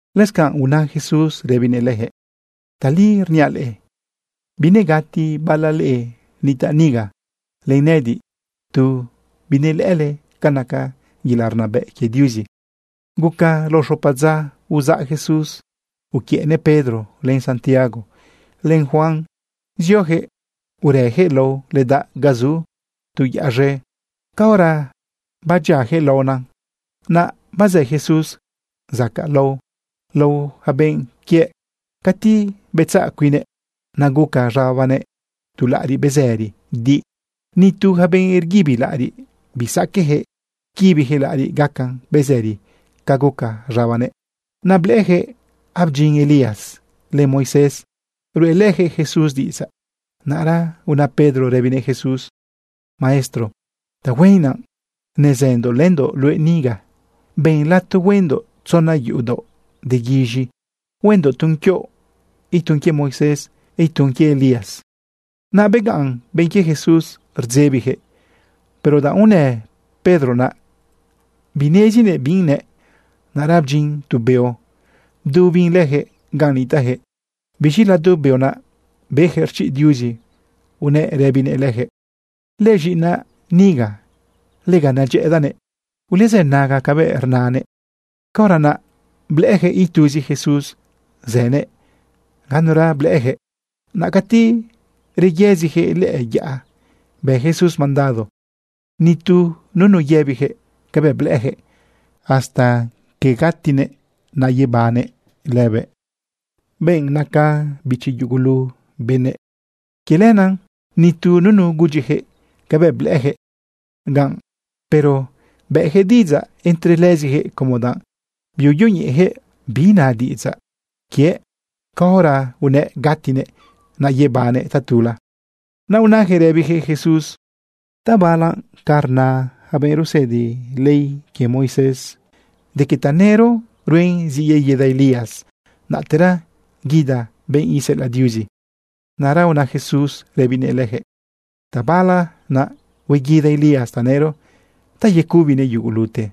Lëscanꞌ una Jesús rëbinëꞌ leyaquëꞌ: ―Tali rniaꞌ leꞌe, binegati bala leꞌe nitaꞌ niga len nëꞌëdiꞌ tu binelëꞌële ca naca yelaꞌ rnabëꞌ quie Diuzi. Guca lao xopa dza, uzaꞌ Jesús uquiëꞌnëꞌ Pedro, len Santiago, len Juan zioyaquëꞌ urëyaquëꞌ lao ledaꞌ ga zu tu yaꞌa z̃e. Caora badyiayaquëꞌ laona, naꞌ bazë Jesús zacaꞌlao lao yaca benꞌ quiëꞌ cati betzaꞌ cuinnëꞌ. Naꞌ guca z̃abanëꞌ tu laꞌariꞌ bezëri di. Ni tu yaca benꞌ rguibi laꞌariꞌ bisaqueꞌyaquëꞌ quibiyaquëꞌ laꞌariꞌ gacan bezëri ca guca z̃abanëꞌ. Naꞌ blëꞌëyaquëꞌ abdyin Elías len Moisés ruꞌelëyaquëꞌ Jesús diꞌidzaꞌ. Naꞌra una Pedro rëbinëꞌ Jesús: ―Maestro, tahuen naꞌ nezëndoꞌ lëndoꞌ luëꞌ niga. Ben lato huendoꞌ tzona yuꞌu daoꞌ de guiz̃i. Huendoꞌ tun quioꞌ, itun quie Moisés, itun quie Elías. Naꞌ begaꞌn benꞌ quie Jesús rdzebiyaquëꞌ. Pero danꞌ unë Pedro naꞌ, binezinëꞌ bi nëꞌ. Naꞌra bdyin tu beo bdubin leyaquëꞌ ganꞌ nitaꞌyaquëꞌ. Biz̃i lado beo naꞌ beyaquëꞌ rchiꞌ Diuzi unëꞌ rëbinëꞌ leyaquëꞌ: ―Lëz̃iꞌinaꞌ niga, lega nedyëꞌëdaꞌnëꞌ. Ulezënaga cabëꞌ rnanëꞌ. Caora naꞌ blëꞌëyaquëꞌ ituzi Jesús zënëꞌ, ganura blëꞌëyaquëꞌ. Naꞌ cati reyëziyaquëꞌ lëꞌë yaꞌa, bë Jesús mandado nitu nunu yëbiyaquëꞌ cabëꞌ blëꞌëyaquëꞌ hasta quie gatinëꞌ naꞌ yebannëꞌ lëbëꞌ, benꞌ naca bichi yugulu benëꞌ. Quie lenaꞌ nitu nunu gudyiyaquëꞌ cabëꞌ blëꞌëyaquëꞌ ganꞌ, pero bëꞌyaquëꞌ diꞌidzaꞌ entre lëziyaquëꞌ como danꞌ biuyoñeꞌeyaquëꞌ bi na diꞌidzaꞌ quiëꞌ caora unëꞌ gatinëꞌ naꞌ yebannëꞌ tatula. Naꞌ unayaquëꞌ rëbiyaquëꞌ Jesús: ―¿Tabala naꞌ ca ina yaca benꞌ rusëdi ley quie Moisés de que tanëro ruen zi yeguida Elías, naꞌtera guida benꞌ iseꞌelaꞌ Diuzi? Naꞌra una Jesús rëbinëꞌ leyaquëꞌ: ―Tabala naꞌ hueguida Elías tanëro ta yecubinëꞌ yugulute.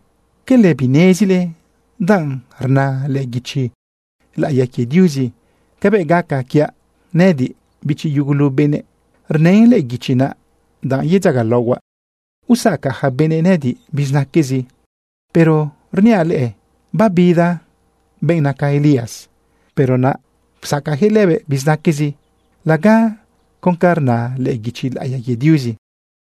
¿Quele binezile danꞌ rna lëꞌë guichi laꞌiya quie Diuzi cabëꞌ gaca quiaꞌ nëꞌëdiꞌ, bichi yugulu benëꞌ? Rnën lëꞌë guichi naꞌ danꞌ yedzagalaohuaꞌ usacaꞌ yaca benëꞌ nëꞌëdiꞌ bizinaquezi. Pero rniaꞌ leꞌe, babida benꞌ naca Elías, pero naꞌ psacaꞌyaquëꞌ lëbëꞌ bizinaquezi laga con ca rna lëꞌë guichi laꞌiya quie Diuzi.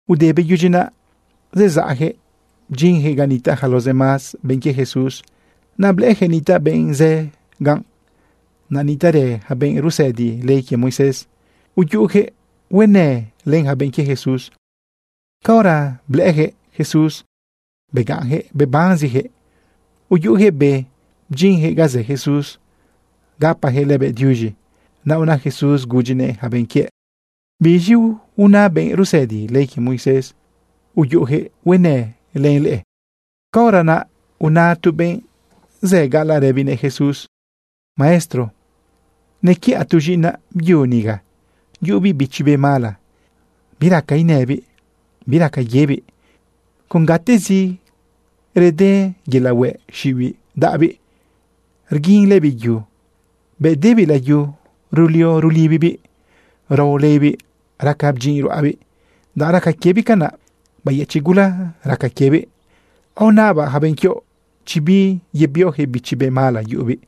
Ude beyudyi naꞌ, zezaꞌyaquëꞌ bdyinyaquëꞌ ga nitaꞌ yaca los demás benꞌ quie Jesús. Naꞌ blëꞌëyaquëꞌ nitaꞌ benꞌ zë ganꞌ. Naꞌ nitaꞌrë yaca benꞌ rusëdi ley quie Moisés uyuꞌuyaquëꞌ huenë len yaca benꞌ quie Jesús. Caora blëꞌëyaquëꞌ Jesús, begaꞌnyaquëꞌ bebanziyaquëꞌ, uyuꞌuyaquëꞌ be, bdyinyaquëꞌ ga zë Jesús, gapayaquëꞌ lëbëꞌ diuz̃i. Naꞌ una Jesús gudyinëꞌ yaca benꞌ quiëꞌ: ―¿Biz̃i una benꞌ rusëdi ley quie Moisés uyuꞌuyaquëꞌ huenë len leꞌe? Caora naꞌ una tu benꞌ zë gaꞌalaꞌ rëbinëꞌ Jesús: ―Maestro, nequiꞌa tu z̃iꞌinaꞌ byu niga. Yuꞌubiꞌ bichi be mala, biraca inëbiꞌ, biraca yebiꞌ. Con gatezi rede yelaꞌ hueꞌ xiꞌibiꞌ daꞌabiꞌ, rguinlëbiꞌ yu. Bëꞌ debiꞌ layu, rulio rulibibiꞌ, rao leibiꞌ, raca bdyinꞌ ruꞌabiꞌ. Danꞌ raca quiebiꞌ canaꞌ, bayëchiꞌ gula raca quiebiꞌ. Aonabaꞌ yaca benꞌ quioꞌ chi biyebioyaquëꞌ bichi be mala yuꞌubiꞌ,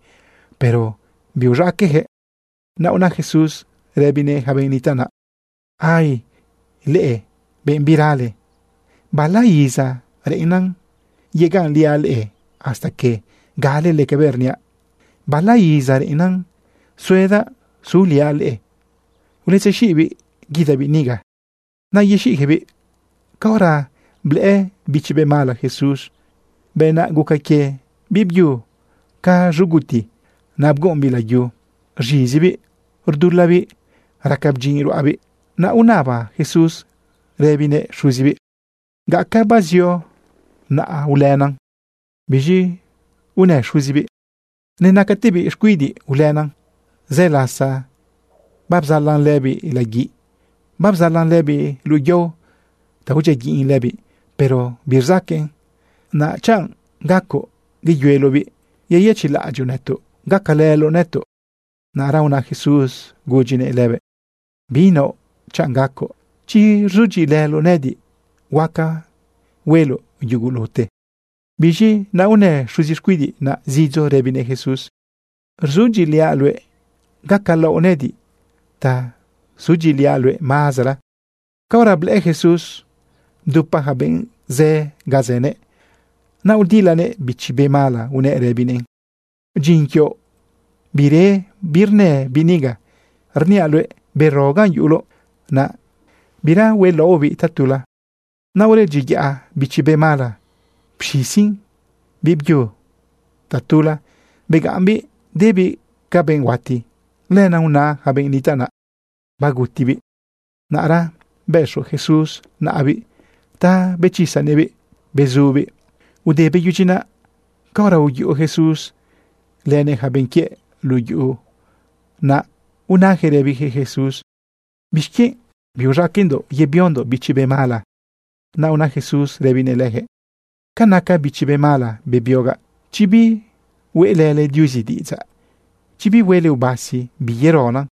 pero biuz̃aqueꞌyaquëꞌ. Naꞌ una Jesús rëbinëꞌ yaca benꞌ nitaꞌ naꞌ: ―¡Ay, leꞌe benꞌ birale! ¿Bala iza reꞌennan yegaꞌnliaꞌ leꞌe hasta que galele cabëꞌ rniaꞌ? ¿Bala iza reꞌennan suedaꞌ suliaꞌ leꞌe? Uletzexiꞌbiꞌ guidabiꞌ niga. Naꞌ yexiꞌyaquëꞌbiꞌ. Caora blëꞌë bichi be mala Jesús, bëꞌ naꞌ guca quie biꞌbyu ca z̃uguti. Naꞌ bguꞌumbiꞌ layu, rz̃izibiꞌ, rdulabiꞌ, raca bdyinꞌ ruꞌabiꞌ. Naꞌ unaba Jesús rëbinëꞌ xuzibiꞌ: ―¿Gaca bazio naꞌ ulëna? Biz̃i unë xuzibiꞌ: ―Nenacatebiꞌ xcuidiꞌ ulëna. Zë lasa babzalan lëbiꞌ laguiꞌ, babzalan lëbiꞌ luꞌu yao ta udyiaguiꞌn lëbiꞌ, pero birzaqueꞌn. Naꞌ chanꞌ gacoꞌ yeyueloꞌbiꞌ, yeyëchiꞌlaꞌadyoꞌ nëtoꞌ gacalëloꞌ nëtoꞌ. Naꞌra una Jesús gudyinëꞌ lëbëꞌ: ―Binaoꞌ chanꞌ gacoꞌ. Chi rzudyiꞌilëloꞌ nëꞌëdiꞌ, huaca hueloꞌ yugulute. Biz̃i naꞌ unë xuzi xcuidiꞌ naꞌ zidzo rëbinëꞌ Jesús: ―Rzudyiꞌiliaꞌ luëꞌ, gacalaoꞌ nëꞌëdiꞌ ta sudyiꞌiliaꞌ luëꞌ mazara. Caora blëꞌë Jesús bdupa yaca benꞌ zë ga zënëꞌ, naꞌ udilanëꞌ bichi be mala unëꞌ rëbinëꞌn: ―Dyin quioꞌ bire birnë biꞌ niga. Rniaꞌ luëꞌ, bero ganꞌ yuꞌuloꞌ naꞌ, bira huelaoꞌbiꞌ tatula. Naꞌ uredyiyaꞌ bichi be mala pxizin biꞌbyu tatula, begaꞌmbiꞌ debiꞌ ca benꞌ huati. Lenaꞌ una yaca benꞌ nitaꞌ naꞌ: ―Bagutibiꞌ. Naꞌra bëxo Jesús naꞌabiꞌ ta bechisanëꞌbiꞌ, bezubiꞌ. Ude beyudyi naꞌ, caora uyuꞌu Jesús lënëꞌ yaca benꞌ quiëꞌ luꞌu yuꞌu, naꞌ unayaquëꞌ rëbiyaquëꞌ Jesús: ―¿Bixquienꞌ biuz̃aqueꞌndoꞌ yebiondoꞌ bichi be mala? Naꞌ una Jesús rëbinëꞌ leyaquëꞌ: ―Ca naca bichi be mala bebiogaꞌ, chi bihueꞌlële Diuzi diꞌidzaꞌ, chi bihuele ubasi, biyerona.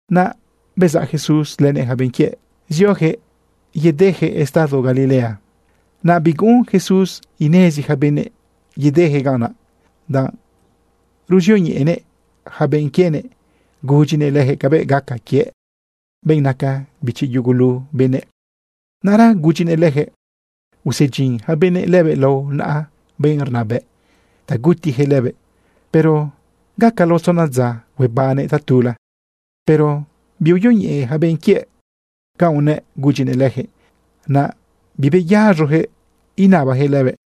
Naꞌ bezaꞌ Jesús lënëꞌ yaca benꞌ quiëꞌ zioyaquëꞌ yedeyaquëꞌ estado Galilea. Naꞌ biguꞌun Jesús inezi yaca benëꞌ yedeyaquëꞌ ganꞌ naꞌ, danꞌ ruzioñeꞌenëꞌ yaca benꞌ quienëꞌ, gudyinëꞌ leyaquëꞌ cabëꞌ gaca quiëꞌ, benꞌ naca bichi yugulu benëꞌ. Naꞌra gudyinëꞌ leyaquëꞌ usedyin yaca benëꞌ lëbëꞌ lao naꞌa benꞌ rnabëꞌ ta gutiyaquëꞌ lëbëꞌ, pero gaca lao tzona dza huebannëꞌ tatula. Pero biuyoñeꞌe yaca benꞌ quiëꞌ canꞌ unëꞌ gudyinëꞌ leyaquëꞌ. Naꞌ bibeyaz̃oyaquëꞌ inabayaquëꞌ lëbëꞌ.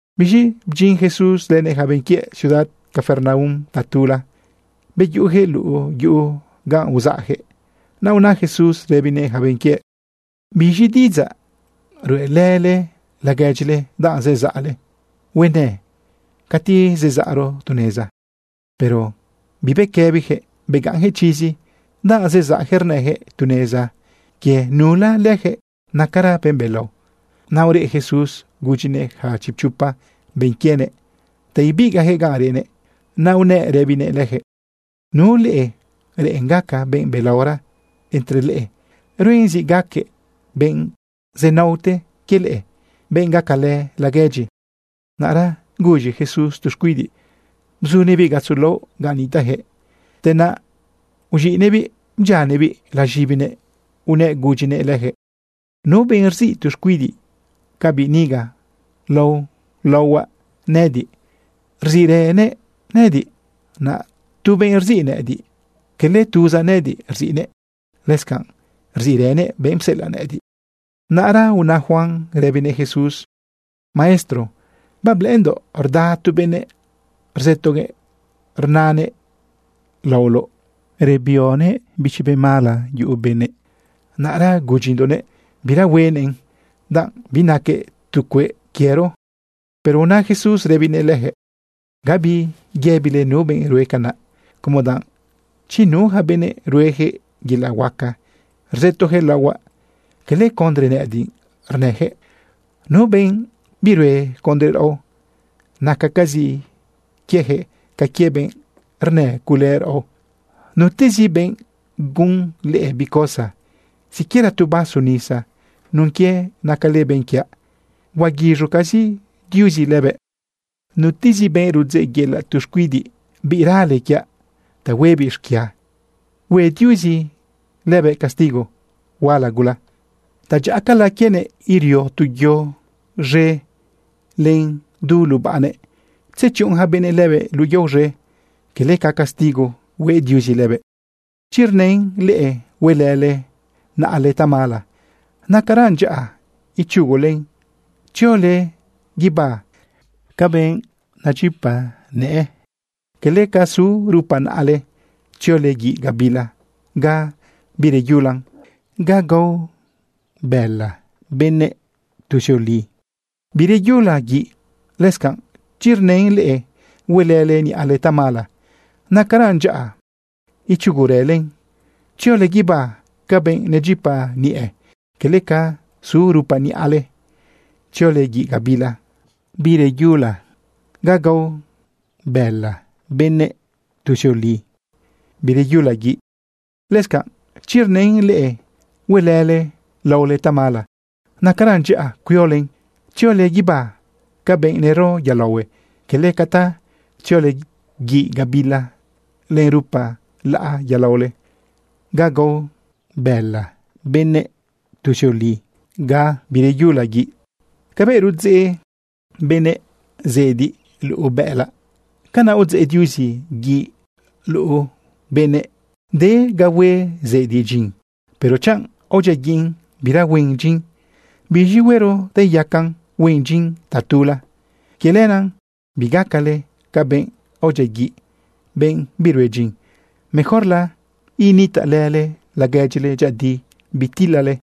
Biz̃i bdyin Jesús lënëꞌ yaca benꞌ quiëꞌ ciudad Capernaum tatula, beyuꞌuyaquëꞌ luꞌu yuꞌu ganꞌ uzaꞌyaquëꞌ. Naꞌ una Jesús rëbinëꞌ yaca benꞌ quiëꞌ: ―¿Biz̃i diꞌidzaꞌ ruꞌelële laguedyile danꞌ zezaꞌle huenë cati zezaꞌro tu neza? Pero bibequëbiyaquëꞌ begaꞌnyaquëꞌ chizi danꞌ zezaꞌyaquëꞌ rnëyaquëꞌ tu neza quie nula leyaquëꞌ nacara benꞌ belao. Naꞌ ureꞌ Jesús gudyinëꞌ yaca chipchopa benꞌ quienëꞌ ta ibigaꞌyaquëꞌ ganꞌ reꞌnëꞌ. Naꞌ unëꞌ rëbinëꞌ leyaquëꞌ: ―Nu leꞌe reꞌen gaca benꞌ belaora entre leꞌe, ruen zi gaquëꞌ benꞌ zenaote quie leꞌe, benꞌ gacalë laguedyi. Naꞌra guz̃i Jesús tu xcuidiꞌ bzunëꞌbiꞌ gatzo laꞌo ganꞌ nitaꞌyaquëꞌ. Te naꞌ uz̃iꞌnëꞌbiꞌ bdyianëꞌbiꞌ laz̃ibinëꞌ unëꞌ gudyinëꞌ leyaquëꞌ: ―Nu benꞌ rziꞌ tu xcuidiꞌ ca biꞌ niga lao laohuaꞌ nëꞌëdiꞌ, rziꞌrënëꞌ nëꞌëdiꞌ. Naꞌ tu benꞌ rziꞌ nëꞌëdiꞌ, quele tuzaꞌ nëꞌëdiꞌ rziꞌnëꞌ, lëscanꞌ rziꞌrënëꞌ benꞌ pseꞌelaꞌ nëꞌëdiꞌ. Naꞌra una Juan rëbinëꞌ Jesús: ―Maestro, bablëꞌëndoꞌ rda tu benëꞌ rzëtoguëꞌ rnanëꞌ laoloꞌ rebioguëꞌ bichi be mala yuꞌu benëꞌ. Naꞌra gudyindoꞌnëꞌ bira huenëꞌn danꞌ binaquëꞌ tu cueꞌ quiero. Pero una Jesús rëbinëꞌ leyaquëꞌ: ―Gabi yëbile nu benꞌ rue canaꞌ, como danꞌ chi nu yaca benëꞌ rueyaquëꞌ yelaꞌ huaca rzëtoyaquëꞌ laohuaꞌ, quele condre nëꞌëdiꞌ rnëyaquëꞌ. Nu benꞌ birue condre raꞌo, nacacazi quieyaquëꞌ ca quie benꞌ rnëcule raꞌo. Nutezi benꞌ gun leꞌe bi cosa siquiera tu vaso nisa nun quie nacale benꞌ quiaꞌ, huaguiz̃ucazi Diuzi lëbëꞌ. ’Nutezi benꞌ rudzeꞌyela tu xcuidiꞌ rale quiaꞌ ta huebiꞌ xquia, hue Diuzi lëbëꞌ castigo huala gula. Tadyaꞌacala quienëꞌ irio tu yo z̃e len du lubaꞌnëꞌ tzechuꞌun yaca benëꞌ lëbëꞌ luꞌu yao z̃e, quele ca castigo hue Diuzi lëbëꞌ. Chi rnën leꞌe huelële naꞌale tamala, nacaran dyaꞌa ichugulen tziole guibá ca benꞌ nedyipa nëꞌë, quele ca zu rupa naꞌale tziole guiꞌ gabila ga bireyulan, ga gao bëla benëꞌ tuzioli, bireyula guiꞌ. Lëscanꞌ chi rnën leꞌe huelële niꞌale tamala, nacaran dyaꞌa ichugurëlen tziole guibá ca benꞌ nedyipa niꞌe, quele ca zu rupa niꞌale tziole guiꞌ gabila bireyulan, ga gao bëla benëꞌ tuzioli, bireyula guiꞌ. Lëscanꞌ chi rnën leꞌe huelële laole tamala, nacaran dyaꞌa cuiolen tziole guibá ca benꞌ nero yolaohue, quele ca ta tziole guiꞌ gabila len rupa laꞌa yolaole, ga gao bëla benëꞌ tuzioli, bireyula guiꞌ. ’Cabëꞌ rudzeꞌ benëꞌ zediꞌ luꞌu bëꞌëlaꞌ, canaꞌ udzeꞌ Diuzi guiꞌ luꞌu benëꞌ. De ga hue zediꞌ dyin, pero chanꞌ aodyiaguiꞌn, bira huen dyin, ¿biz̃i huero ta iyacan huen dyin tatula? Quie lenaꞌ bigacale ca benꞌ aodyiaguiꞌ, benꞌ birue dyin, mejorla nitaꞌlële laguedyile dyëꞌëdi, bitilale.